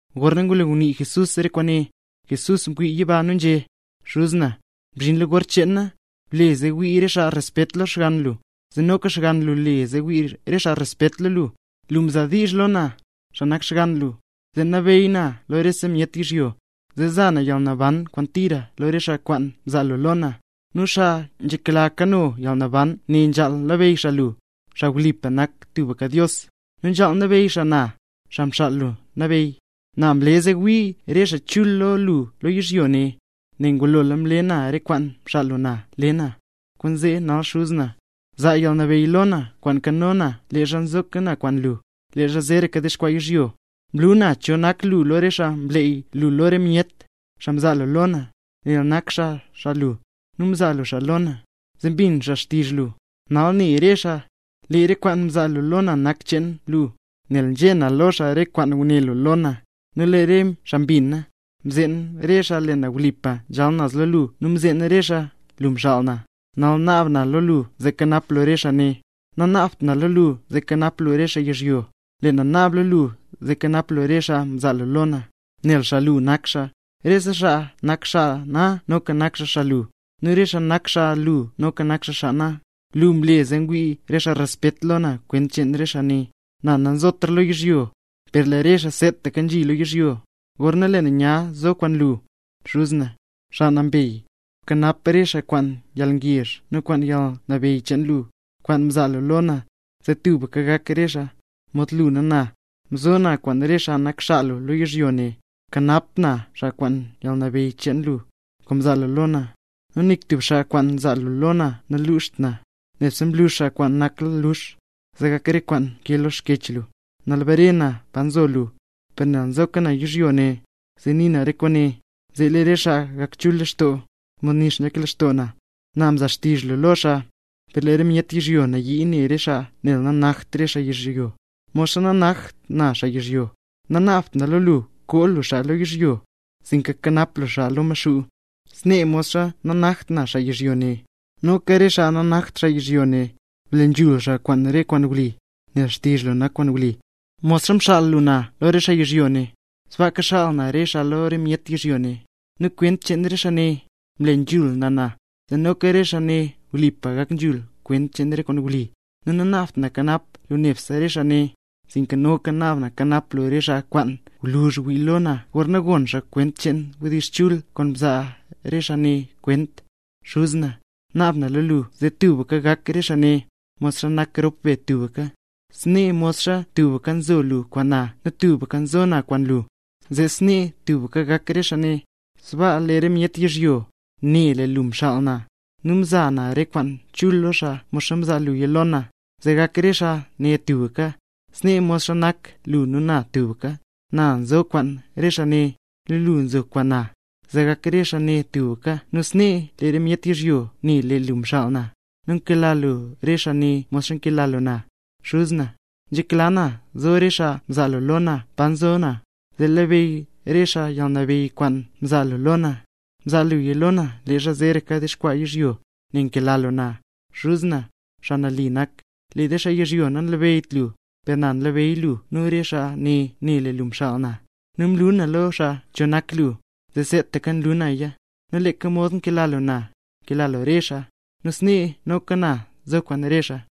Gorna ngulo ngunii Jesús re kwaane, Jesús mwii yiba nu nzhé xaa: —Xuz na, mzhinla gor cheen na. Ble zee wii re xaa respet lo Xgann lu, zee noka Xgann lu le zee wii re xaa respet lo lu. Lu mzaa diizh lo na, xaa nak Xgann lu, zee nabeey na lo rese myet yizhyo, zee zaa na yalnaban kwaan tira lo re xaa kwaan mzaa lu lo na. Nu xaa nzhekla kano yalnaban ne nzhaal labeyy xaa lu, xaa wlipa nak tubka Dios, nu nzhaal labeyy xaa na, Xaa Mxaal lu Nabeyy. ’Na mle zee wii re xaa chul lo lu lo yizhyo ne, nel ngulola mle na re kwaan mxaal lu na le na. Kwaanzee nal Xuz na, zaa yalnabeyy lo na kwaan mkano na leezha mzo na kwaan lu, leezha zeeraka dexkwaa yizhyo. ’Mlu na cho nak lu lo re xaa mleey lu lo re myet, xaa mzaa lu lo na, nel nak xaa xaa lu, nu mzaa lu xaa lo na, zee mbin xaa xtizh lu. Nal ne re xaa, lee re kwaan mzaa lu lo na nak xcheen lu; nel nzhé na lo xaa re kwaan nguné lu lo na, nu lee re xaa mbina. Mzeen re xaa lee na wlipa nzhal naz lo lu, nu mzeen re xaa lu mxaal na. ’Nal naab na lo lu zee kanap lu re xaa ne; nanaabt na lo lu zee kanap lu re xaa yizhyo; lee na naab lo lu zee kanap lu re xaa mzaa lu lo na, nel xaa lu nak xaa. Rese xaa nak xaa na noka nak xaa xaa lu, nu re xaa nak xaa lu noka nak xaa xaa na. Lu mle zee ngwii re myet respet lo na kwent cheen re xaa ne. ’Na nazotra lo yizhyo; per lee re xaa seetaka nzhi lo yizhyo, gorna lee na nya zo kwaan lu. Xuz na, xaa nambey, bkanap re xaa kwaan yalngezh nu kwaan yalnabeyy cheen lu, kwaan mzaa lu lo na, zee tubka gak re xaa, mod lu nu na. Nzo na kwaan re xaa nak xaa lu lo yizhyo ne, nkanap na xaa kwaan yalnabeyy cheen le lu, kwaan mzaa lu lo na. Nu nik tub xaa kwaan mzaa lu lo na namluxt na, nebse mlux xaa kwaan nakla lux, zee gak re kwaan nkee lo Xkyech lu. ’Nal bare na pa nzo lu. Per nel nzoka na yizhyo ne, zee nii na re kwaane, zee lee re xaa gak chul lextoo, mod nix nzhak lextoo na. Na mza xtizh lu lo xaa, per lee re myet yizhyo nayii ne re xaa, nel nanakt re xaa xaa yizhyo, modxa nanaktaka na xaa yizhyo. Nanaabt na lo lu koo lu xaa lo yizhyo, sinka kanap lu xaa lo Maxuu. Snee modxa nanakt na xaa yizhyo ne, noka re xaa nanakt xaa yizhyo ne. Ble nzhul xaa kwaan re kwaan wli; nel xtizh lu nak kwaan wli. Modxa mxaal lu na lo re xaa yizhyo ne, sbaaka xaal na re xaa lo re myet yizhyo ne. Nu kwent cheen re xaa ne, mle nzhul na na, zee noka re xaa ne wlipa gak nzhul kwent cheen re kwaan wli. ’Nu nanaabt na kanap lu nebse re xaa ne, sinka noka naab na kanap lu re xaa kwaan gwluzh wii lo na, gorna gon xaa kwent cheen wdizh chul kwaan zaa re xaa ne kwent. Xuz na, naab na lo lu zee tubka gak re xaa ne, mod nak rop be tubka, snee mod tubka nzo lu kwaan na nu tubka nzo na kwaan lu, zee snee tubka gak re xaa ne; sbaa lee re myet yizhyo, ne lee lu mxaal na. Nu mza na re kwaan chul lo xaa mod mzaa luya lo na, zee gak re xaa ne tubka, snee modxa nak lu nu na tubka. Na nzo kwaan re xaa ne, nu lu nzo kwaan na, zee gak re xaa ne tubka, nu snee lee re myet yizhyo ne ne lee lu mxaal na, nu nkela lu re xaa ne mod nkela lu na. ’Xuz na, nzhekla na zo re xaa mzaa lu lo na pa nzo na, zee labeyy re xaa yalnabeyy kwaan mzaa lu lo na. Mzaa luya lo na leezha zeeraka dexkwaa yizhyo, nel nkela lu na. Xuz na, xaa nali nak, lee re xaa yizhyo nanlabeyyt lu; per na nlabeyy na lu nu re xaa ne ne lee lu mxaal na. Nu mlu na lo xaa cho nak lu, nu seetaka nlu naya, nu leeka mod nkela lu na, kela lu re xaa, nu snee noka na zo kwaan re xaa.